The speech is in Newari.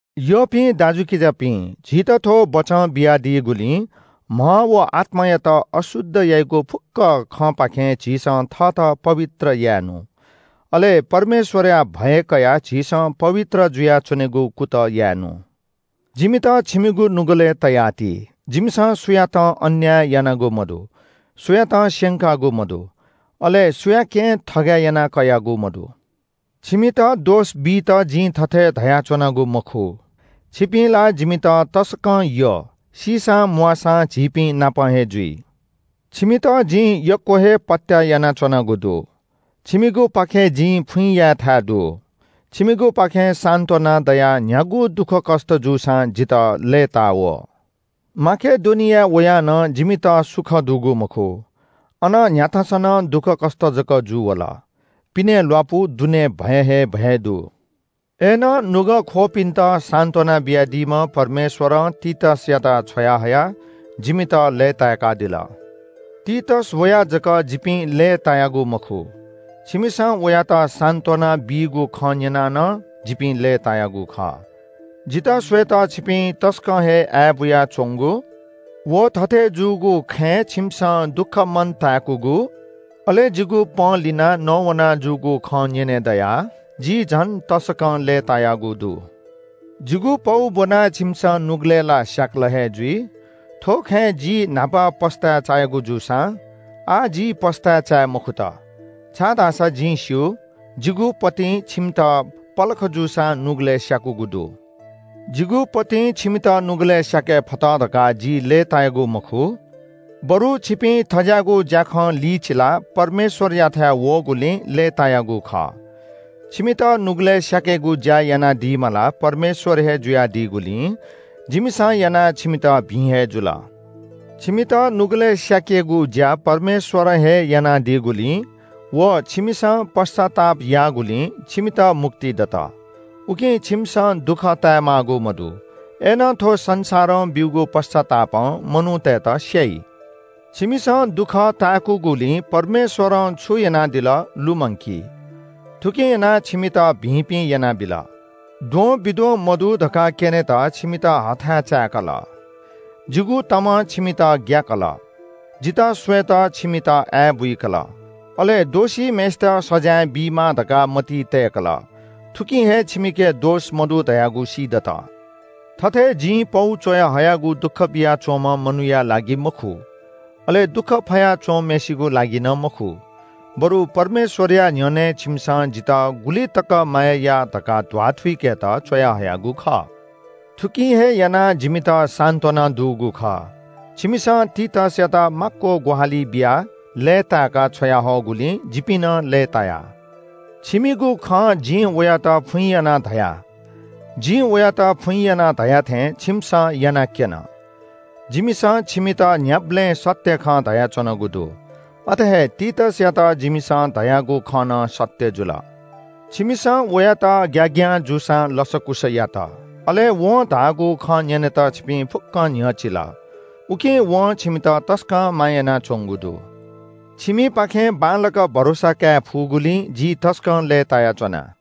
यःपिं दाजुकिजापिं, झीत थ्‍व बचं बियादीगुलिं म्‍ह व आत्‍मायात अशुद्ध याइगु फुक्‍क खँपाखें झीसं थःत पवित्र याये नु। अले परमेश्‍वरया भय कयाः झीसं पवित्र जुयाच्‍वनेगु कुतः याये नु। जिमित छिमिगु नुगलय् तयाति। जिमिसं सुयातं अन्‍याय यानागु मदु, सुयातं स्‍यंकागु मदु, अले सुयाकें थगय् यानाकयागु मदु। छिमित दोष बीत जिं थथे धयाच्‍वनागु मखु। छिपिं ला जिमित तसकं यः। सीसां म्‍वाःसां झीपिंनापं हे जुइ। छिमित जिं यक्‍व हे पत्‍याः यानाच्‍वनागु दु। छिमिगुपाखें जिं फुइँ यायेथाय् दु। छिमिगुपाखें सान्‍त्‍वना दयाः न्‍ह्यागु दुःखकष्‍ट जूसां जितः लय्‌ता वः। माकेडोनियाय् वयाः नं जिमित सुख दुगु मखु। अन न्‍ह्याथासं नं दुःखकष्‍ट जक जूवल। पिने ल्‍वापु, दुने भय हे भय दु। अय्‌नं नुगः ख्‍वःपिन्‍त सान्‍त्‍वना बियादीम्‍ह परमेश्‍वरं तीतसयात छ्वयाहयाः जिमित लय्‌ताय्‌कादिल। तीतस वयाः जक जिपिं लय्‌तायागु मखु, छिमिसं वयात सान्‍त्‍वना बीगु खँ न्‍यनाः नं जिपिं लय्‌तायागु खः। जितः स्‍वयेत छिपिं तसकं हे आय्‌बुया च्‍वंगु, व थथे जूगु खँय् छिमिसं दुःख मन ताय्‌कूगु, अले जिगु पंलिनाः नवाना जूगु खँ न्‍यने दयाः जि झन तसकं लय्‌तायागु दु। जिगु पौ ब्‍वनाः छिमिसं नुगलय् ला स्‍याकल हे जुइ, थ्‍व खँय् जि न्‍हापा पस्‍ताय् चायागु जूसां आः जि पस्‍ताय् चाये मखुत। छाय्‌धाःसा जिं स्‍यू, जिगु पौपाखें छिमित पलख जूसां नुगलय् स्‍याकूगु दु। जिगु पौपाखें छिमित नुगलय् स्‍याके फत धकाः जि लय्‌तायागु मखु, बरु छिपिं थज्‍याःगु ज्‍याखं लिचिलाः परमेश्‍वरयाथाय् वःगुलिं लय्‌तायागु खः। छिमित नुगलय् स्‍याकेगु ज्‍या यानादीम्‍ह ला परमेश्‍वर हे जुयादीगुलिं जिमिसं यानाः छिमित भिं हे जुल। छिमित नुगलय् स्‍याकेगु ज्‍या परमेश्‍वरं हे यानादीगुलिं व छिमिसं पश्‍चाताप याःगुलिं छिमित मुक्ति दत, उकिं छिमिसं दुःख ताये माःगु मदु। अय्‌नं थ्‍व संसारं ब्‍यूगु पश्‍चातापं मनूतय्‌त स्‍याइ। छिमिसं दुःख ताय्‌कूगुलिं परमेश्‍वरं छु यानादिल लुमंकी। थुकिं यानाः छिमित भिंपिं यानाबिल, द्वंबिद्वं मदु धकाः क्‍यनेत छिमित हथाय् चाय्‌कल। जिगु तमं छिमित ग्‍याकल, जितः स्‍वयेत छिमित आय्‌बुइकल। अले दोषीम्‍हय्‌सित सजाँय बीमाः धकाः मतिइ तय्‌कल। थुकिं हे छिमिके दोष मदु धयागु सीदत। थथे जिं पौ च्‍वयाहयागु दुःख बियाच्‍वंम्‍ह मनूया लागि मखु, अले दुःख फया च्‍वंम्‍हय्‌सिगु लागि नं मखु, बरु परमेश्‍वरया न्‍ह्यःने छिमिसं जितः गुलि तक माया याः धकाः ध्‍वाथुइकेत च्‍वयाहयागु खः। थुकिं हे यानाः जिमित सान्‍त्‍वना दुगु खः। छिमिसं तीतसयात माक्‍व ग्‍वाहालि बियाः लय्‌ताय्‌काः छ्वयाहःगुलिं जिपिं नं लय्‌ताया। छिमिगु खँ जिं वयात फुइँ यानाः धया। जिं वयात फुइँ यानाः धया थें छिमिसं यानाक्‍यन। जिमिसं छिमित न्‍ह्याबलें सत्‍य खँ धयाच्‍वनागु दु। अथे हे तीतसयात जिमिसं धयागु खँ नं सत्‍य जुल। छिमिसं वयात ग्‍याग्‍यां जूसां लसकुस यात, अले वं धाःगु खँ न्‍यनेत छिपिं फुक्‍क न्‍ह्यचिल। उकिं वं छिमित तसकं माया यानाच्‍वंगु दु। छिमिपाखें बांलाक भरोसा काये फुगुलिं जि तसकं लय्‌तायाच्‍वना।